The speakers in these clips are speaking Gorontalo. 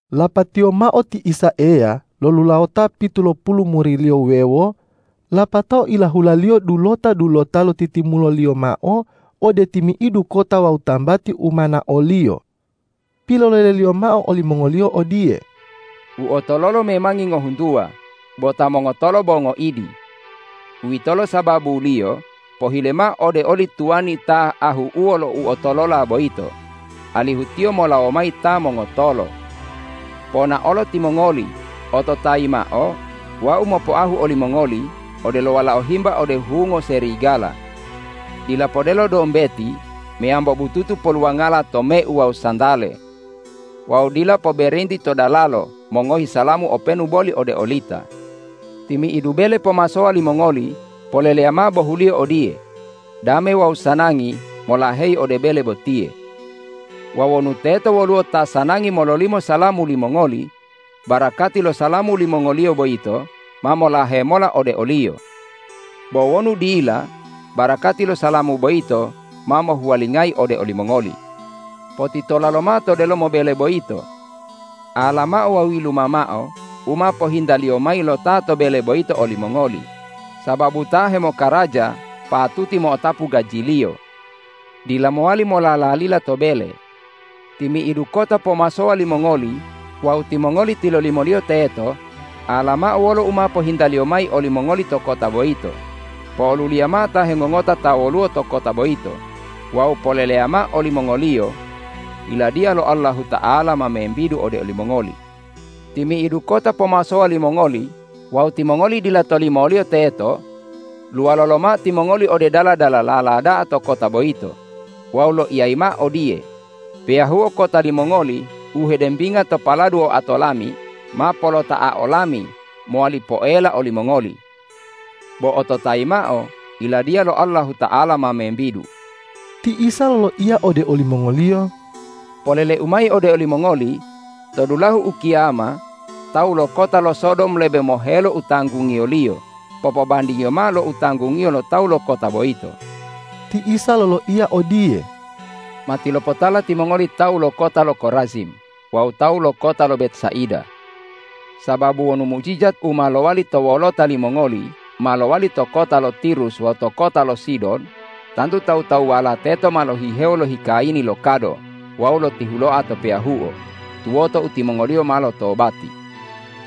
Lapatiyo mao ti Isa Eya lolulawota pitulopulu muri-Liyo wuwewo, lapatao ilahula-Liyo dulota-dulota lotitimulo-Liyo mao ode timi'idu kota wawu tambati u ma nao-Liyo. Pilolele-Liyo mao olimongoliyo odiye,”U otololo memangi ngohuntuwa, bo ta mongotolo bo ngoidi. Uwitolo sababuliyo pohile mao ode oli tuwani ta ahu'uwo lo uotolola boyito, alihu tiyo molawo mayi ta mongotolo. Ponaolo timongoli! Ototayi mao: Wau mopoahu olimongoli odelo walao himba ode hungo serigala. Dila podelo dombeti meyambo bututu poluwangala tomeu wawu santale. Wawu dila poberenti to dalalo mongohi salamu openu boli ode olita. Timi'idu bele pomasowa limongoli, poleleya mao bohuliyo odiye, ’Dame wawu sanangi molaheyi ode bele botiye.’ Wawu wonu teto woluwo ta sanangi mololimo salamu limongoli, barakati lo salamu limongoliyo boyito ma molahe mola ode oliyo. Bo wonu dila, barakati lo salamu boyito ma mohuwalingayi ode olimongoli. Potitola lomao to delomo bele boyito. Ala mao wawu yiluma mao u ma pohintaliyo mayi lo ta to bele boyito olimongoli, sababu ta hemokaraja patuti mo'otapu gajiliyo. Dila mowali molalalila to bele. Timi'idu kota pomasowa limongoli wawu timongoli tilolimoliyo teto, ala mao wolo u ma pilohintaliyo mayi olimongoli to kota boyito, po'oluliya mao ta hengongota ta woluwo to kota boyito wawu poleleya mao olimongoliyo, ’Yiladiya lo Allahuta'ala ma membidu ode olimongoli.’ Timi'idu kota pomasowa limongoli wawu timongoli dila tolimoliyo teto, luwalo lomao timongoli ode dala-dalalala da'a to kota boyito wawu loiyayi mao odiye, ’Peyahuo kota limongoli u hedembinga to paladu oato lami, ma polota'ao lami mowali poela olimongoli. Bo ototayi mao: Yiladiya lo Allahuta'ala ma membidu!’” Ti Isa loloiya ode olimongoliyo,”Polele-U mayi ode olimongoli: To dulahu ukiyama tawu lo kota lo Sodom lebe mohelo u tanggungiyoliyo popobandingiyo mao lo u tanggungiyo lo tawu lo kota boyito.” Ti Isa loloiya odiye,”Matilopotala timongoli tawu lo kota lo Korazim wawu tawu lo kota lo Betsaida! Sababu wonu mujijat u ma lowali to wolota limongoli ma lowali to kota lo Tirus wawu to kota lo Sidon, tantu tawu-tawuwala teto ma lohihewo lohikayini lo kado wawu lotihuloa to peyahuo, tuwoto u timongoliyo ma lotobati.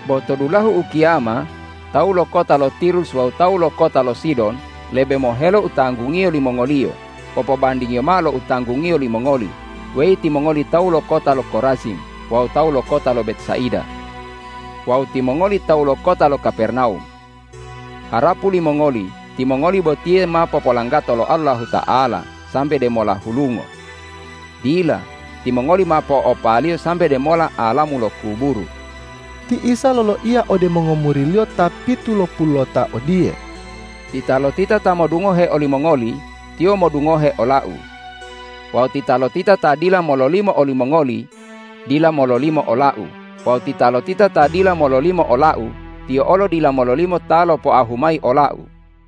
Bo to dulahu ukiyama tawu lo kota lo Tirus wawu tawu lo kota lo Sidon lebe mohelo u tanggungiyo limongoliyo popobandingiyo mao lo u tanggungiyo limongoli, weyi timongoli tawu lo kota lo Korazim wawu tawu lo kota lo Betsaida. Wawu timongoli tawu lo kota lo Kapernawum! Harapu limongoli timongoli botiye ma popolanggato lo Allahuta'ala sambe demola hulungo? Dila! Timongoli ma po'opa-Liyo sambe demola alamu lo kuburu!” Ti Isa loloiya ode mongomuri-Liyo ta pitulopululota odiye,”Titalotita ta modungohe olimongoli, tiyo modungohe ola-U. Wawu titalotita ta dila mololimo olimongoli dila mololimo ola-U wawu titalotita ta dila mololimo ola-U, tiyo olo dila mololimo Ta lopoahu mayi ola-U.”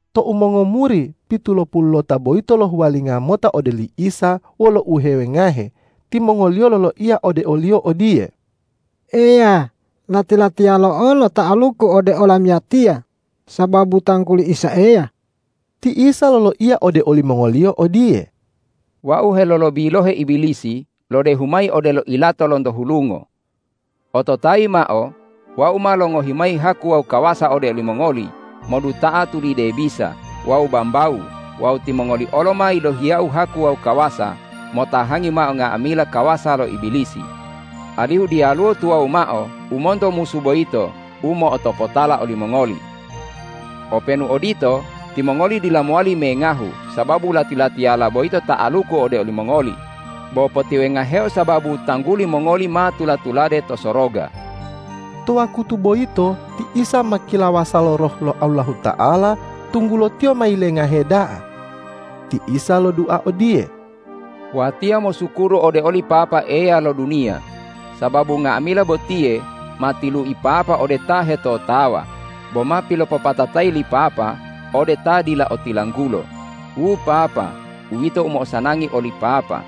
Tou mongomuri pitulopululota boyito lohuwalinga mota ode oli Isa wolo uhewengahe, timongoliyo loloiya ode o-Liyo odiye,”Eya, lati-latiyalo olo ta'aluku ode olamiyatiya sababu tangguli Isa Eya!” Ti Isa loloiya ode olimongoliyo odiye,”Wau helolobilohe Ibilisi lodehu mayi odelo ilato lonto hulungo. Ototayi mao: Wau ma longohi mayi haku wawu kawasa ode olimongoli moduta'a tulide bisa wawu bambawu wawu timongoli olo ma yilohiya-U haku wawu kawasa motahangi mao nga'amila kawasa lo Ibilisi, alihu diyaluwo tuwawu mao u monto musu boyito u mo'otopotala olimongoli. Openu odito, timongoli dila mowali mengahu sababu lati-latiyala boyito ta'aluku ode olimongoli, bo potiwengaheo sababu tangguli mongoli ma tula-tulade to soroga.” To wakutu boyito ti Isa ma kilawasa lo Roh lo Allahuta'ala, tunggulo Tiyo ma yilengahe da'a. Ti Isa lodua odiye,”Watiya mosukuru ode oli Papa Eya lo duniya, sababu nga'amila botiye ma tilui Papa ode ta hetotawa, bo ma pilopopatatayi li Papa ode ta dila otilanggulo. Wu Papa, uwito u mo'osanangi oli Papa.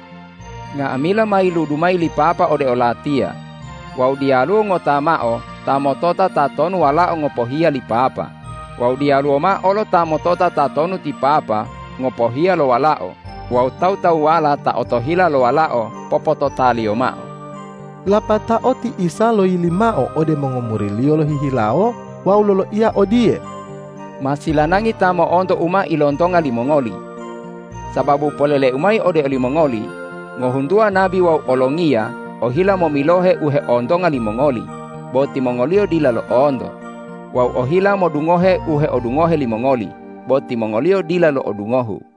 Nga'amila ma yiludu mayi li Papa ode o-Latiya wawu diyaluwo ngota mao ta motota tatonu Walao ngopohiya li Papa, wawu diyaluwo mao olo ta motota tatonu ti Papa ngopohiya lo Walao wawu tawu-tawuwala ta otohila lo Walao popotota-Liyo mao.” Lapatao ti Isa loyili mao ode mongomuri-Liyo lohihilawo wawu loloiya odiye,”Ma silanangi ta mo'onto u ma ilontonga limongoli. Sababu polele-U mayi ode olimongoli: Ngohuntuwa nabi wawu olongiya ohila momilohe u heontonga limongoli, bo timongoliyo dila lo'onto, wawu ohila modungohe u heodungohe limongoli, bo timongoliyo dila lo'odungohu.”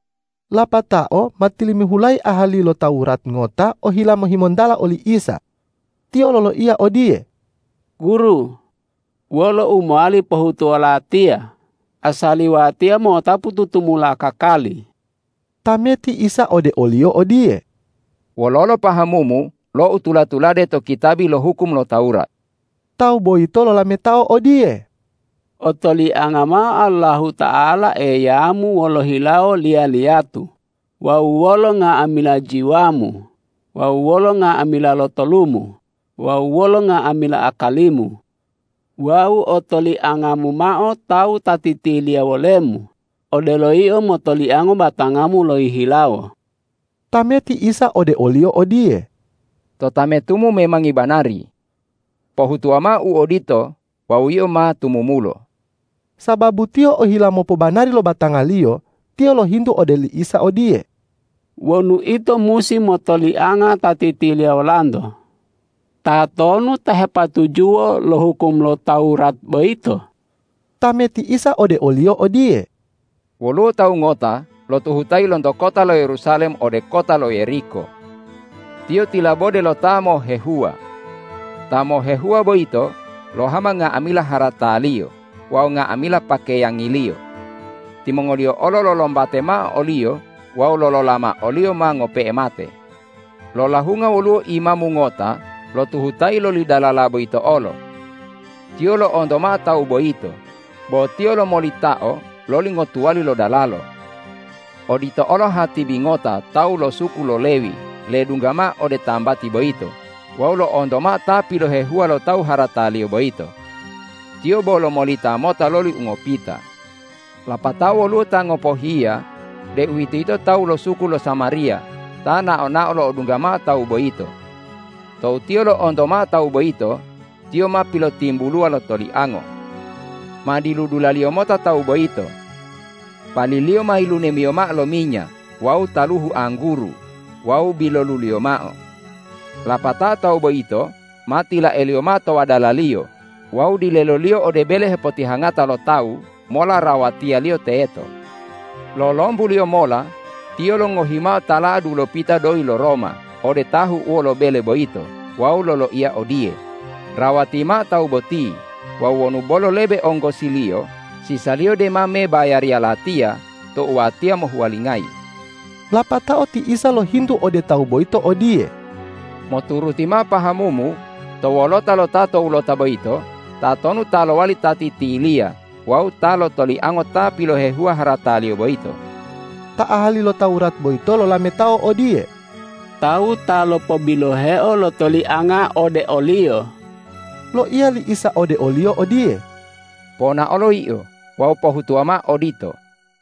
Lapatao ma tilimihulayi ahali lo Tawurat ngota ohila mohimontala oli Isa. Tiyo loloiya odiye,”Guru, wolo u mowali pohutuwo latiya asali watiya mo'otapu tutumula kakali?” Tameti Isa ode oliyo odiye,”Wololo pahamumu lo u tula-tulade to kitabi lo hukum lo Tawurat?” Tawu boyito lolametao odiye,”Otolianga mao Allahuta'ala Eyamu wolo hilawo liya-liyatu wawu wolo nga'amila jiwamu wawu wolo nga'amila lotolumu wawu wolo nga'amila akalimu, wawu otoliangamu mao tawu ta titiliya wolemu odelo yio motoliango batangamu lohihilawo.” Tameti Isa ode oliyo odiye,”Totametumu memangi banari. Pohutuwa mao u odito wawu yio ma tumumulo.” Sababu tiyo ohila mopobanari lo batangaliyo, tiyo lohintu ode oli Isa odiye,”Wonu ito musi motolianga ta titiliya wolanto, tatonu ta hepatujuwo lo hukum lo Tawurat boyito?” Tameti Isa ode oliyo odiye,”Woluwo tawu ngota lotuhutayi lonto kota lo Yerusalem ode kota lo Yeriko. Tiyo tilabode lo ta mohehuwa. Ta mohehuwa boyito lohama nga'amila harataliyo wawu nga'amila pakeyangiliyo. Timongoliyo olo lolombate mao oliyo wawu lolola mao oliyo ma ngope'e mate. Lolahunga woluwo imamu ngota lotuhutayi loli dalala boyito olo. Tiyo lo'onto mao tawu boyito, bo tiyo lomolitao loli ngotuwali lo dalalo. Odito olo hatibi ngota tawu lo suku lo Lewi ledungga mao ode tambati boyito wawu lo'onto mao ta pilohehuwa lo tawu harataliyo boyito. Tiyo bo lomolita mota loli ungopita. Lapatao woluwo ta ngopohiya, deuwitoyito tawu lo suku lo Samariya ta nao-nao lo'odungga mao tawu boyito. Tou tiyo lo'onto mao tawu boyito, tiyo ma pilotimbuluwa lo toliango. Ma diludulaliyo mota tawu boyito. Paliliyo ma yilunemiyo mao lo minya wawu taluhu angguru wawu biloluliyo mao. Lapatao tawu boyito ma tilaeliyo mao to wadalaliyo wawu dileloliyo ode bele hepotihangata lo tawu mola rawatiyaliyo teto. Lolombuliyo mola tiyo longohi mao tala'a dulopita doyi lo Roma ode tahu'uwo lo bele boyito wawu loloiya odiye, ’Rawati mao tawu boti wawu wonu bolo lebe onggosiliyo, sisaliyo dema mebayariya latiya tou watiya mohuwalingayi.’” Lapatao ti Isa lohintu ode tawu boyito odiye,”Moturuti mao pahamumu to wolota lo ta towulota boyito, tatonu ta lowali ta titiliya wawu ta lotoliango ta pilohehuwa harataliyo boyito?” Ta ahali lo Tawurat boyito lolametao odiye,”Tawu ta lopobiloheo lo tolianga ode oliyo.” Loiya li Isa ode oliyo odiye,”Ponaolo yio wawu pohutuwa mao odito!”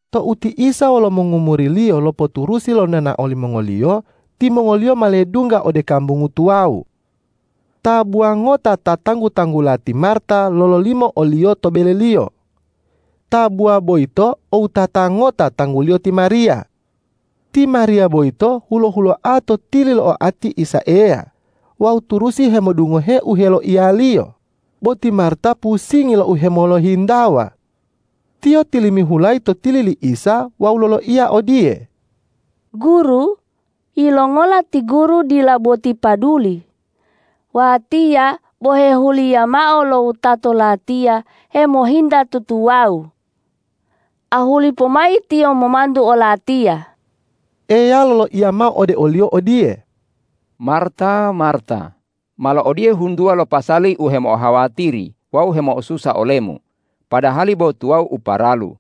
Tou ti Isa wolo mongomuri-Liyo lopoturusi lo nonao limongoliyo, timongoliyo ma ledungga ode kambungu tuwawu. Tabuwa ngota ta tanggu-tanggula ti Marta lololimo o-Liyo to beleliyo. Tabuwa boyito o wutata ngota tangguliyo ti Mariya. Ti Mariya boyito hulo-huloa to tili lo oati Isa Eya wawu turusi hemodungohe u heloiya-Liyo, bo ti Marta pusingi lo uhemolohintawa. Tiyo tilimihulayi to tili li Isa wawu loloiya odiye,”Guru, yilongola ti Guru dila boti paduli, watiya bo hehuliya mao lo wutato latiya hemohinta tutuwawu? Ahuli pomayi tiyo momantu olatiya!” Eya loloiya mao ode oliyo odiye,”Marta, Marta! Malo odiye huntuwa lo pasali u hemo'ohawatiri wawu hemo'osusa olemu, padahali bo tuwawu u paralu.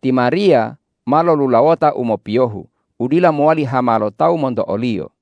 Ti Mariya ma lolulawota u mopiyohu, udila mowali hama lo tawu monto oliyo.”